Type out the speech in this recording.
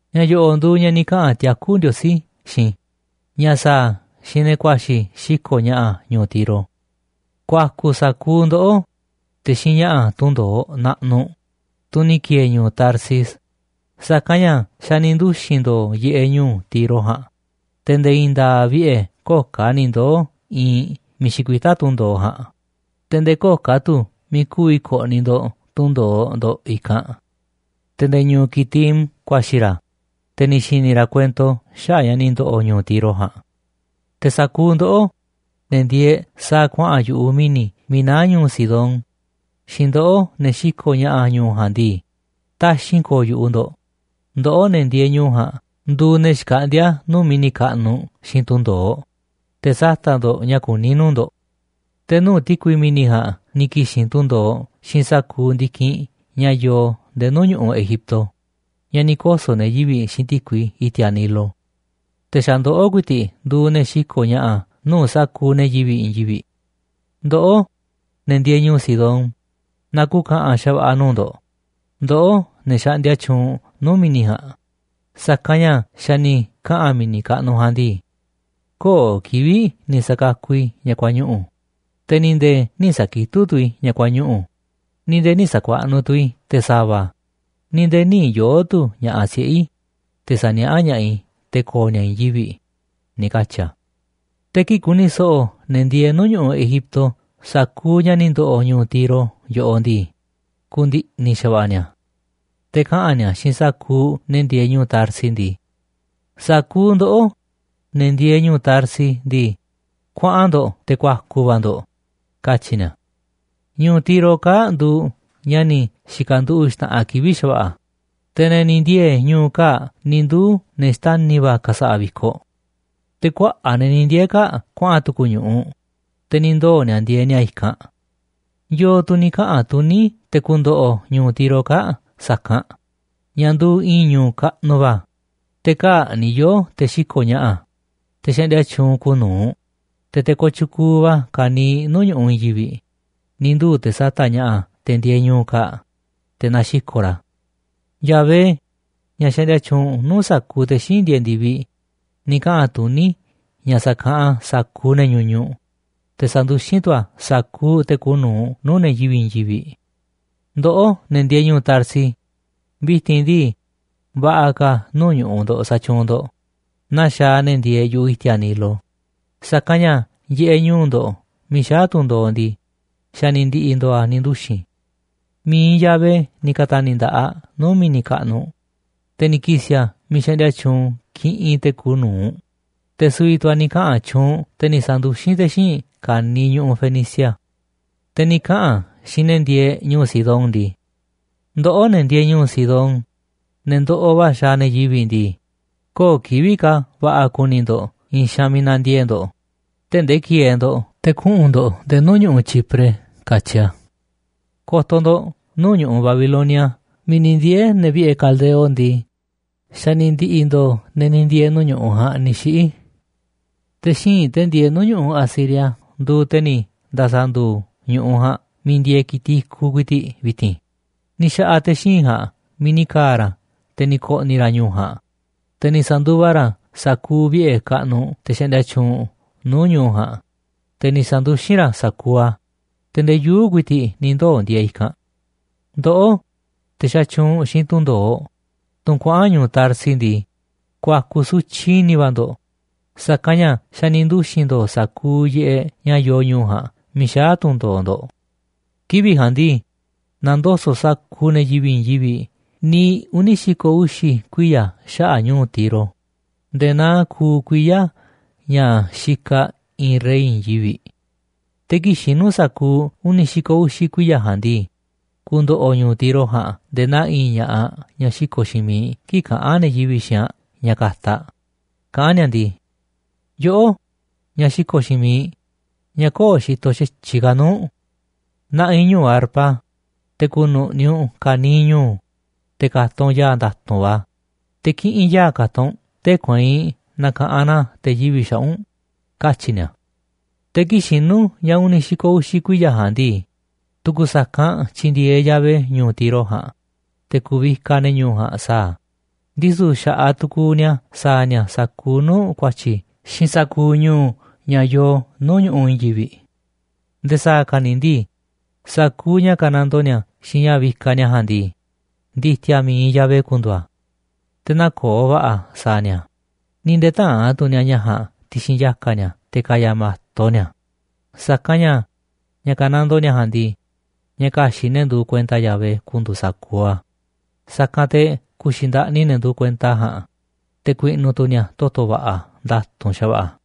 Ña̱ yo̱ꞌo̱ꞌ nduuꞌ ña̱ ni̱ kaꞌa̱n tiakú Ndiosí xiinꞌ i̱ ña̱ sa̱a̱ a̱ xiinꞌ ne̱ ku̱a̱xi̱ xiko̱ꞌ ña̱ꞌa̱ ñu̱u̱ Tiro: Ku̱a̱ku̱ sa̱kuuꞌ ndoꞌó, te̱ xiinꞌ ña̱ꞌa̱ tunꞌ ndo̱oꞌ naꞌnuꞌ, tunꞌ ni̱ ki̱e̱e̱ ñu̱u̱ Tarsis, sa̱kanꞌ ña̱ xa̱ ni̱ nduxi̱n ndo̱o̱ yiꞌeꞌ ñu̱u̱ Tiro ja̱a̱nꞌ, te̱ nde̱e̱ i̱i̱n nda̱a̱ꞌ vi̱ꞌe̱ köo̱ꞌ ka̱ ni̱ ndoo̱ iinꞌ miiꞌ xikuitá tunꞌ ndo̱oꞌ ja̱a̱nꞌ, te̱ nde̱e̱ köo̱ꞌ ka̱ tu̱ miiꞌ ku̱vi̱ ko̱ꞌni̱ ndo̱ꞌ tunꞌ ndo̱oꞌ ndo̱ꞌ i̱kanꞌ. Te̱ nde̱e̱ ñu̱u̱ Quitim ku̱a̱xi̱ ra̱, te̱ ni̱ xi̱ni̱ ra̱ kuento xaꞌa̱ꞌ ña̱ ni̱ ndo̱ꞌo̱ ñu̱u̱ Tiro ja̱a̱nꞌ. Te̱ sa̱kuuꞌ ndoꞌó, ne̱ ndieeꞌ sa̱a̱ kuaꞌa̱n yu̱ꞌuꞌ mi̱ni̱ miiꞌ naá ñu̱u̱ Sidón xiinꞌ ndoꞌó, ne̱ xiko̱ꞌ ña̱ꞌa̱ ñu̱u̱ ja̱a̱nꞌ ndii, taxi̱nꞌ ko̱o̱ yu̱ꞌuꞌ ndo̱ꞌ, ndoꞌó ne̱ ndieeꞌ ñu̱u̱ ja̱a̱nꞌ nduuꞌ ne̱ xkaꞌndíá nuu̱ꞌ mi̱ni̱ kaꞌnuꞌ xiinꞌ tunꞌ ndo̱oꞌ, te̱ sata̱ꞌ ndo̱ꞌ ña̱ kuní nuu̱ꞌ ndo̱ꞌ. Te̱ nuu̱ꞌ ti̱kui mi̱ni̱ ja̱a̱nꞌ ni̱ ki̱xi̱n tunꞌ ndo̱oꞌ xiinꞌ sa̱kuuꞌ ndi̱kinꞌ ña̱ yoo nde̱e̱ nuu̱ꞌ ñu̱ꞌuꞌ Egipto, ña̱ ni̱ koso̱ ne̱ yivi̱ꞌ xiinꞌ ti̱kui i̱ti̱a̱ Nilo. Te̱ xa̱ ndoꞌó ku̱i̱ti̱ꞌ nduuꞌ ne̱ xiko̱ꞌ ña̱ꞌa̱ nuu̱ꞌ sa̱kuuꞌ ne̱ yivi̱ꞌ i̱i̱n yivi̱ꞌ. Ndoꞌó, ne̱ ndieeꞌ ñu̱u̱ Sidón, na ku̱ka̱ꞌa̱n xa̱va̱ꞌa̱ nuu̱ꞌ ndo̱ꞌ, ndoꞌó ne̱ xaꞌndia tyuunꞌ nuu̱ꞌ mi̱ni̱ ja̱a̱nꞌ, sa̱kanꞌ ña̱ xa̱ ni̱ kaꞌa̱n mi̱ni̱ kaꞌnuꞌ ja̱a̱nꞌ ndii: “Köo̱ꞌ kivi̱ꞌ ni̱ sa̱kakuꞌ i̱ ña̱ kuañuꞌu̱, te̱ ni̱ nde̱e̱ nï̱ sa̱kitúꞌ tu̱ i̱ ña̱ kuañuꞌu̱, ni̱ nde̱e̱ nï̱ sa̱kuaꞌnuꞌ tu̱ i̱ te̱ sa̱va̱, ni̱ nde̱e̱ nï̱ yoo̱ꞌ tu̱ ña̱ꞌaꞌ siꞌe̱ i̱, te̱ sa̱niaꞌá ña̱ꞌaꞌ i̱ te̱ ko̱o̱ ni̱a̱ i̱i̱n yivi̱ꞌ”, ni̱ katyi̱ a̱. Te̱ kii̱ꞌ ku̱ni̱ so̱ꞌo̱ ne̱ ndieeꞌ nuu̱ꞌ ñu̱ꞌuꞌ Egipto sa̱kuuꞌ ña̱ ni̱ ndo̱ꞌo̱ ñu̱u̱ Tiro yoꞌoꞌ ndii, ku̱ndi̱ꞌni̱ xa̱va̱ꞌa̱ ni̱a̱. Te̱ kaꞌa̱n ni̱a̱ xiinꞌ sa̱kuuꞌ ne̱ ndieeꞌ ñu̱u̱ Tarsis ndii: “Sa̱kuuꞌ ndoꞌó, ne̱ ndieeꞌ ñu̱u̱ Tarsis ndii, kuaꞌan ndo̱ꞌ te̱ ku̱a̱ku̱ va̱ ndo̱ꞌ”, katyi̱ ni̱a̱. Ñu̱u̱ Tiro kaa̱ꞌ nduuꞌ ña̱ ni̱ xi̱ka̱nduꞌu̱ꞌ xta̱ꞌanꞌ kivi̱ꞌ xa̱va̱ꞌa̱, te̱ ne̱ ni̱ ndiee̱ ñu̱u̱ kaa̱ꞌ ni̱ nduu̱ ne̱ xtani̱ va̱ ka̱sa̱ꞌa̱ vi̱koꞌ. Te̱ kuaꞌa̱ꞌ ne̱ ni̱ ndiee̱ kaa̱ꞌ kuaꞌa̱n tu̱ku̱ ñu̱ꞌuꞌ, te̱ ni̱ ndoo̱ ni̱a̱ ndieeꞌ ni̱a̱ i̱kanꞌ. ¿Yo̱o̱ tu̱ ni̱ kaꞌa̱n tuní te̱ ku̱ndo̱ꞌo̱ ñu̱u̱ Tiro kaa̱ꞌ sa̱kanꞌ ña̱ nduuꞌ i̱i̱n ñu̱u̱ kaꞌnuꞌ va̱, te̱ kaa̱ꞌ ni̱ yoo̱ te̱ xiko̱ꞌ ña̱ꞌa̱, te̱ xaꞌndia tyuunꞌ kuuꞌ nu̱uꞌ, te̱ te̱ kooꞌ tyukuuꞌ va̱ ka̱niiꞌ nuu̱ꞌ ñu̱ꞌuꞌ i̱i̱n yivi̱ꞌ, ni̱ nduu̱ te̱ sata̱ꞌ ña̱ꞌa̱ te̱ ndieeꞌ ñu̱u̱ kaa̱ꞌ, te̱ naxiko̱ꞌ ra̱ a̱? Yahvé, ña̱ xaꞌndia tyuunꞌ nuu̱ꞌ sa̱kuuꞌ te̱ xíinꞌ ndieeꞌ ndi̱viꞌ, ni̱ kaꞌa̱n tuní ña̱ sa̱kaꞌanꞌ a̱ sa̱kuuꞌ ne̱ ñuñuꞌ, te̱ sa̱nduxín tu̱ a̱ sa̱kuuꞌ te̱ kuuꞌ nu̱uꞌ nuu̱ꞌ ne̱ yivi̱ꞌ i̱i̱n yivi̱ꞌ. Ndoꞌó, ne̱ ndieeꞌ ñu̱u̱ Tarsis, vi̱ti̱n ndii, va̱ꞌa̱ ka̱ nuu̱ꞌ ñu̱ꞌuꞌ ndo̱ꞌ sa̱tyuunꞌ ndo̱ꞌ, naa xaaꞌ ne̱ ndieeꞌ yu̱ꞌuꞌ i̱ti̱a̱ Nilo, sa̱kanꞌ ña̱ yiꞌeꞌ ñu̱u̱ ndo̱ꞌ miiꞌ xaá tunꞌ ndo̱oꞌ ndii, xa̱ ni̱ ndi̱ꞌi̱ ndo̱o̱ a̱ ni̱ nduxi̱n. Mi̱iꞌ Yahvé ni̱ ka̱ta̱ni̱ nda̱ꞌaꞌ nuu̱ꞌ mi̱ni̱ kaꞌnuꞌ, te̱ ni̱ ki̱si̱ a̱ miiꞌ xaꞌndia tyuunꞌ kiꞌinꞌ te̱ kuuꞌ nu̱uꞌ, te̱ su̱vi̱ tu̱ a̱ ni̱ kaꞌa̱n tyuunꞌ, te̱ ni̱ sa̱nduxín te̱ xíinꞌ ka̱niiꞌ ñu̱ꞌuꞌ Fenicia. Te̱ ni̱ kaꞌa̱n a̱ xiinꞌ ne̱ ndieeꞌ ñu̱u̱ Sidón ndii: “Ndoꞌó, ne̱ ndieeꞌ ñu̱u̱ Sidón, ne̱ ndoꞌoꞌ va̱ xaaꞌ ne̱ yivi̱ꞌ ndii, köo̱ꞌ kivi̱ꞌ ka̱ va̱ꞌa̱ ku̱ni̱ ndo̱ꞌ i̱i̱n xaanꞌ miiꞌ na̱ndiee̱ꞌ ndo̱ꞌ, tee̱ꞌ ndee ki̱e̱e̱ ndo̱ꞌ te̱ kuꞌu̱n ndo̱ꞌ nde̱e̱ nuu̱ꞌ ñu̱ꞌuꞌ Chipre”, katyi a̱. Ko̱to̱ ndo̱ꞌ nuu̱ꞌ ñu̱ꞌuꞌ Babilonia miiꞌ ni̱ ndiee̱ ne̱ vi̱ꞌe̱ caldeo ndii, xa̱ ni̱ ndi̱ꞌi̱ ndo̱o̱ ne̱ ni̱ ndiee̱ nuu̱ꞌ ñu̱ꞌuꞌ ja̱a̱nꞌ ni̱ xiꞌi̱. Te̱ xíinꞌ te̱ ndieeꞌ nuu̱ꞌ ñu̱ꞌuꞌ Asiria nduuꞌ te̱ ni̱ nda̱sa̱ nduuꞌ ñu̱ꞌuꞌ ja̱a̱nꞌ miiꞌ ndieeꞌ ki̱tiꞌ i̱kuꞌ ku̱i̱ti̱ꞌ vi̱ti̱n, ni̱ xa̱ꞌa̱ te̱ xíinꞌ ja̱a̱nꞌ miiꞌ ni̱ ka̱a̱ ra̱, te̱ ni̱ ko̱ꞌni̱ ra̱ ñu̱u̱ ja̱a̱nꞌ, te̱ ni̱ sa̱nduva ra̱ sa̱kuuꞌ vi̱ꞌe̱ kaꞌnuꞌ te̱ xaꞌndia tyuunꞌ nuu̱ꞌ ñu̱u̱ ja̱a̱nꞌ, te̱ ni̱ sa̱nduxín ra̱ sa̱kuuꞌ a̱, te̱ ndee yuu̱ꞌ ku̱i̱ti̱ꞌ ni̱ ndoo̱ ndieeꞌ a̱ i̱kanꞌ. Ndoꞌó, te̱ xatyuunꞌ xiinꞌ tunꞌ ndo̱oꞌ, tunꞌ kuaꞌa̱n ñu̱u̱ Tarsis ndii, ku̱a̱ku̱ sutyiꞌ i̱ni̱ va̱ ndo̱ꞌ, sa̱kanꞌ ña̱ xa̱ ni̱ nduxi̱n ndo̱o̱ sa̱kuuꞌ yiꞌeꞌ ña̱ yoo ñu̱u̱ ja̱a̱nꞌ miiꞌ xaá tunꞌ ndo̱oꞌ ndo̱ꞌ. Kivi̱ꞌ ja̱a̱nꞌ ndii, na̱ndoso̱ꞌ sa̱kuuꞌ ne̱ yivi̱ꞌ i̱i̱n yivi̱ꞌ niiꞌ uni̱ xi̱ko̱ uxi̱ kuiya̱ xaꞌa̱ꞌ ñu̱u̱ Tiro nde̱e̱ naa kuuꞌ kuiya̱ ña̱ xikaꞌ i̱i̱n rey i̱i̱n yivi̱ꞌ. Te̱ kii̱ꞌ xinu̱ sa̱kuuꞌ uni̱ xi̱ko̱ uxi̱ kuiya̱ ja̱a̱nꞌ ndii, ku̱ndo̱ꞌo̱ ñu̱u̱ Tiro ja̱a̱nꞌ nde̱e̱ naa i̱i̱n ña̱ꞌaꞌ ñaꞌ xiko̱ꞌ xiinꞌ miiꞌ kii̱ꞌ kaꞌán ne̱ yivi̱ꞌ xiinꞌ aꞌ ña̱ ka̱ta̱ aꞌ kaꞌán ni̱a̱ ndii: “Yoꞌó, ñaꞌ xiko̱ꞌ xiinꞌ miiꞌ, ñaꞌ köo̱ꞌ xitoꞌ xa̱tyiꞌ ka̱ nuu̱ꞌ. Na̱ꞌi̱ ñu̱u̱ arpa, te̱ ku̱nu̱ꞌni̱ u̱nꞌ ka̱niiꞌ ñu̱u̱, te̱ ka̱ta̱ u̱nꞌ ya̱a̱ nda̱tu̱nꞌ va̱, te̱ kiꞌinꞌ ya̱a̱ ka̱ta̱ u̱nꞌ, tee̱ꞌ kueinꞌ na̱ka̱ꞌanꞌ na te̱ yivi̱ꞌ xaꞌa̱ꞌ u̱nꞌ”, katyi̱ ni̱a̱. Te̱ kii̱ꞌ xinu̱ ña̱ uni̱ xi̱ko̱ uxi̱ kuiya̱ ja̱a̱nꞌ ndii, tu̱ku̱ sa̱kanꞌ tyi̱ndi̱e̱eꞌ Yahvé ñu̱u̱ Tiro ja̱a̱nꞌ, te̱ ku̱vikaꞌ ne̱ ñu̱u̱ ja̱a̱nꞌ sa̱a̱ a̱, ndisu̱ xa̱ꞌaꞌ tu̱ku̱u̱ ni̱a̱ sa̱a̱ ni̱a̱ sa̱kuuꞌ nuu̱ꞌ ku̱a̱tyi̱ xiinꞌ sa̱kuuꞌ ñu̱u̱ ña̱ yoo nuu̱ꞌ ñu̱ꞌuꞌ i̱i̱n yivi̱ꞌ. Nde̱e̱ sa̱a̱ ka̱ ni̱ ndii, sa̱kuuꞌ ña̱ ka̱nandoo ni̱a̱ xiinꞌ ña̱ vikaꞌ ni̱a̱ ja̱a̱nꞌ ndii, ndi̱ti̱a̱ mi̱iꞌ Yahvé ku̱ndu̱u̱ a̱, te̱ nä̱koo̱ va̱ꞌa̱ a̱ sa̱a̱ ni̱a̱, ni̱ nde̱e̱ tä̱a̱n tu̱ ni̱a̱ ña̱ ja̱a̱nꞌ ti̱xi̱n yaka̱ ni̱a̱ te̱ ka̱ya̱ ma̱to ni̱a̱ a̱. Sa̱kanꞌ ña̱ ña̱ ka̱nandoo ni̱a̱ ja̱a̱nꞌ ndii, ña̱ ka̱xi̱ꞌ ne̱ nduuꞌ kuenta Yahvé ku̱ndu̱u̱ sa̱kuuꞌ a̱, sa̱kanꞌ te̱ ku̱xi̱ ndaꞌni ne̱ nduuꞌ kuenta a̱ ja̱a̱nꞌ, te̱ ku̱i̱ꞌnu̱ tu̱ ni̱a̱ toto̱ va̱ꞌa̱ nda̱tu̱nꞌ xa̱va̱ꞌa̱.